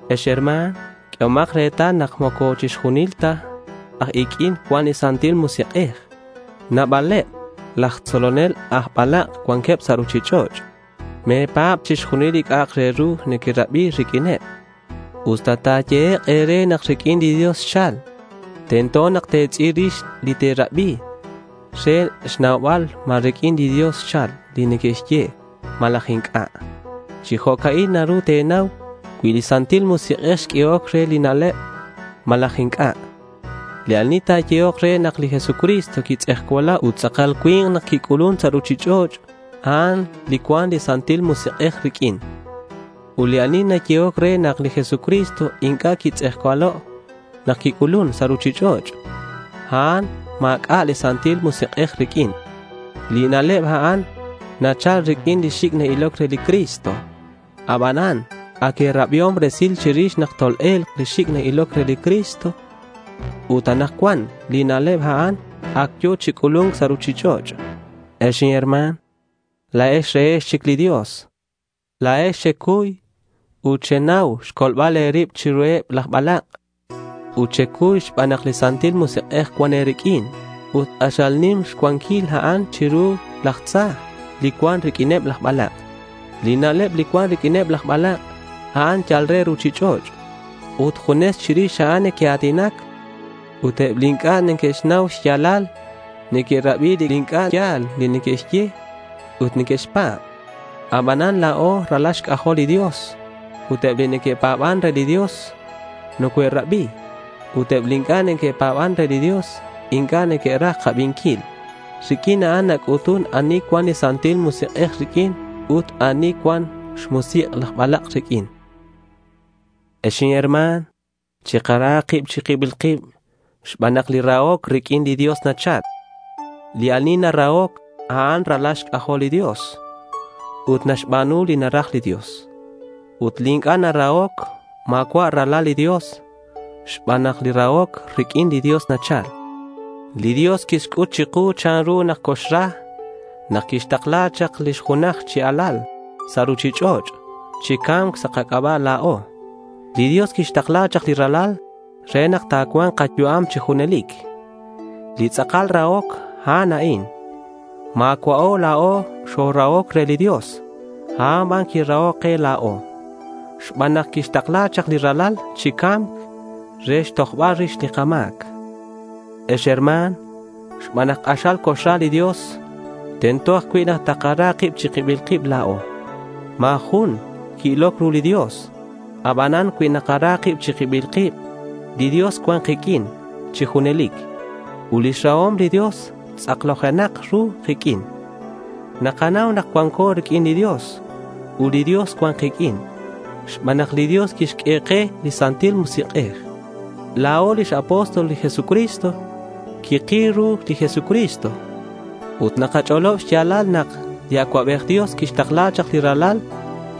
Ex herma̱n, q'uehomak retal nak moco chixjunil ta aj iq'uin cuan li Santil Musik'ej. Nabaleb laj tzolonel aj balak' cuanqueb sa' ruchich'och'. Me̱pa̱b chixjunil li c'a'ak re ru nequerabi riq'uineb, usta ta̱yehek' e̱re nak riq'uin li Dios xchal. Tento nak te̱tz'il rix li te̱rabi re xnaubal ma riq'uin li Dios xchal li neque'xye malaj inc'a'. Chi jo'ca'in naru te̱nau cui li Santil Musik'ej xq'uehoc re li na'leb malaj inc'a'. Li ani ta̱yehok re nak li Jesucristo quitz'ejcualo' ut tz'akal cui̱nk nak quic'ulun sa' ruchich'och', a'an li cuan li Santil Musik'ej riq'uin. Ut li ani ta̱yehok re nak li Jesucristo inc'a' quitz'ejcualo' nak quic'ulun sa' ruchich'och', a'an ma̱c'a' li Santil Musik'ej riq'uin. Li na'leb a'an nachal riq'uin li xic' na-iloc re li Cristo. Abanan ac e̱rabiom resil chirix nak tol-e̱lk li xic' na-iloc re li Cristo. Ut anakcuan li na'leb a'an ac yo̱ chi c'ulu̱nc sa' ruchich'och'. Ex inherma̱n, la̱ex rehex chic li Dios. La̱ex xecuy ut xenau xcolbal e̱rib chiruheb laj balak'. Xecuy xban nak li Santil Musik'ej cuan e̱riq'uin ut k'axal nim xcuanquil a'an chiru laj tza li cuan riq'uineb laj balak'. Li na'leb li cuan riq'uineb laj balak', a'an yal re ruchich'och' ut junes chirix a'an neque'a̱tinac. Ut eb li inc'a' neque'xnau xya̱lal neque'rabi li inc'a' ya̱l li neque'xye ut neque'xpa̱b. Abanan la̱o ralal xc'ajol li Dios. Ut eb li neque'pa̱ban re li Dios nocoe'rabi. Ut eb li inc'a' neque'pa̱ban re li Dios inc'a' neque'raj kabinquil. Riq'uin a'an nac'utun ani cuan li Santil Musik'ej riq'uin ut ani cuan xmusik' laj balak' riq'uin. Ex inherma̱n, chikara kib chi kibil kib xban nak li rahoc riq'uin li Dios nachal. Li ani narahoc, a'an ralal li Dios ut naxba̱nu li naraj li Dios. Ut li inc'a' narahoc ma̱cua' ralal li Dios xban nak li rahoc riq'uin li Dios nachal. Li Dios quixc'ut chiku chanru nak nocoxra nak quixtakla chak lix junaj chi Alal sa' ruchich'och' chi ca̱mc sa' kac'aba' la̱o. Li Dios quixtakla chak li Ralal re nak ta̱cua̱nk kayu'am chi junelic. Li tz'akal rahoc, a'an a'in: ma̱cua'o la̱o xorahoc re li Dios. A'an ban quirahoc ke la̱o xban nak quixtakla chak li Ralal chi ca̱mc re xtojbal rix li kama̱c. Ex herma̱n, xban nak k'axal nocoxra li Dios, tento ajcui' nak takara kib chi kibil kib la̱o. Ma̱ jun qui-iloc ru li Dios. Abanan cui nakara kib chi kibil kib, li Dios cuan kiq'uin chi junelic. Ut lix rahom li Dios tz'aklojenak ru kiq'uin. Nakanau nak cuanco riq'uin li Dios ut li Dios cuan kiq'uin xban nak li Dios quixq'ue ke li Santil Musik'ej. La̱o lix apóstol li Jesucristo. Quikil ru li Jesucristo. Ut nakach'olob xya̱lal nak li Acuabej Dios quixtakla chak li Ralal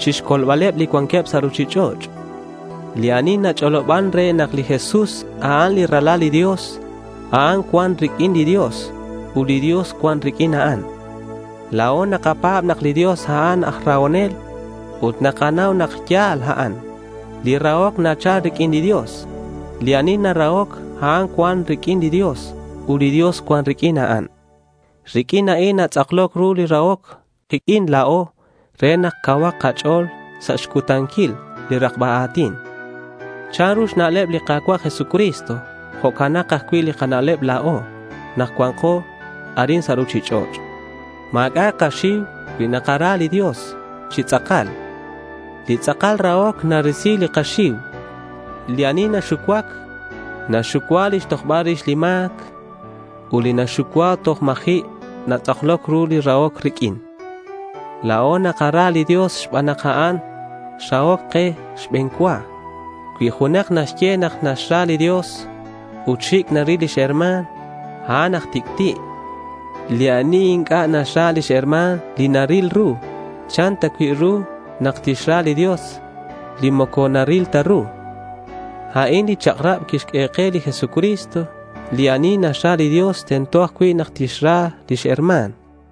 chixcolbaleb li cuanqueb sa' ruchich'och'. Li ani nach'oloban re nak li Jesús, a'an li Ralal li Dios, a'an cuan riq'uin li Dios, ut li Dios cuan riq'uin a'an. La̱o nakapa̱b nak li Dios, a'an aj rahonel ut nakanau nak ya̱l a'an. Li rahoc nachal riq'uin li Dios. Li ani narahoc, a'an cuan riq'uin li Dios ut li Dios cuan riq'uin a'an. Riq'uin a'in ta̱tz'aklok ru li rahoc kiq'uin la̱o re nak cauhak kach'o̱l sa' xcutanquil li rakba a̱tin. Chanru xna'leb li Ka̱cua' Jesucristo, jo'canak ajcui' li kana'leb la̱o nak cua̱nko arin sa' ruchich'och'. Ma̱c'a' kaxiu cui nakara li Dios chi tz'akal. Li tz'akal rahoc narisi li xiu. Li ani naxucuac, naxxucua lix tojbal rix lix ma̱c, ut li naxucuac toj ma̱ji' natz'akloc ru li rahoc riq'uin. La̱o nakara li Dios xban nak a'an xrahoc ke xbe̱n cua. Cui junak naxye nak naxra li Dios ut xic' naril lix herma̱n, a'an aj tic'ti'. Li ani inc'a' naxra lix herma̱n li naril ru, ¿chan ta cui' ru nak tixra li Dios li moco naril ta ru? A'in li chak'rab quixq'ue ke li Jesucristo: Li ani naxra li Dios, tento ajcui' nak tixra lix herma̱n.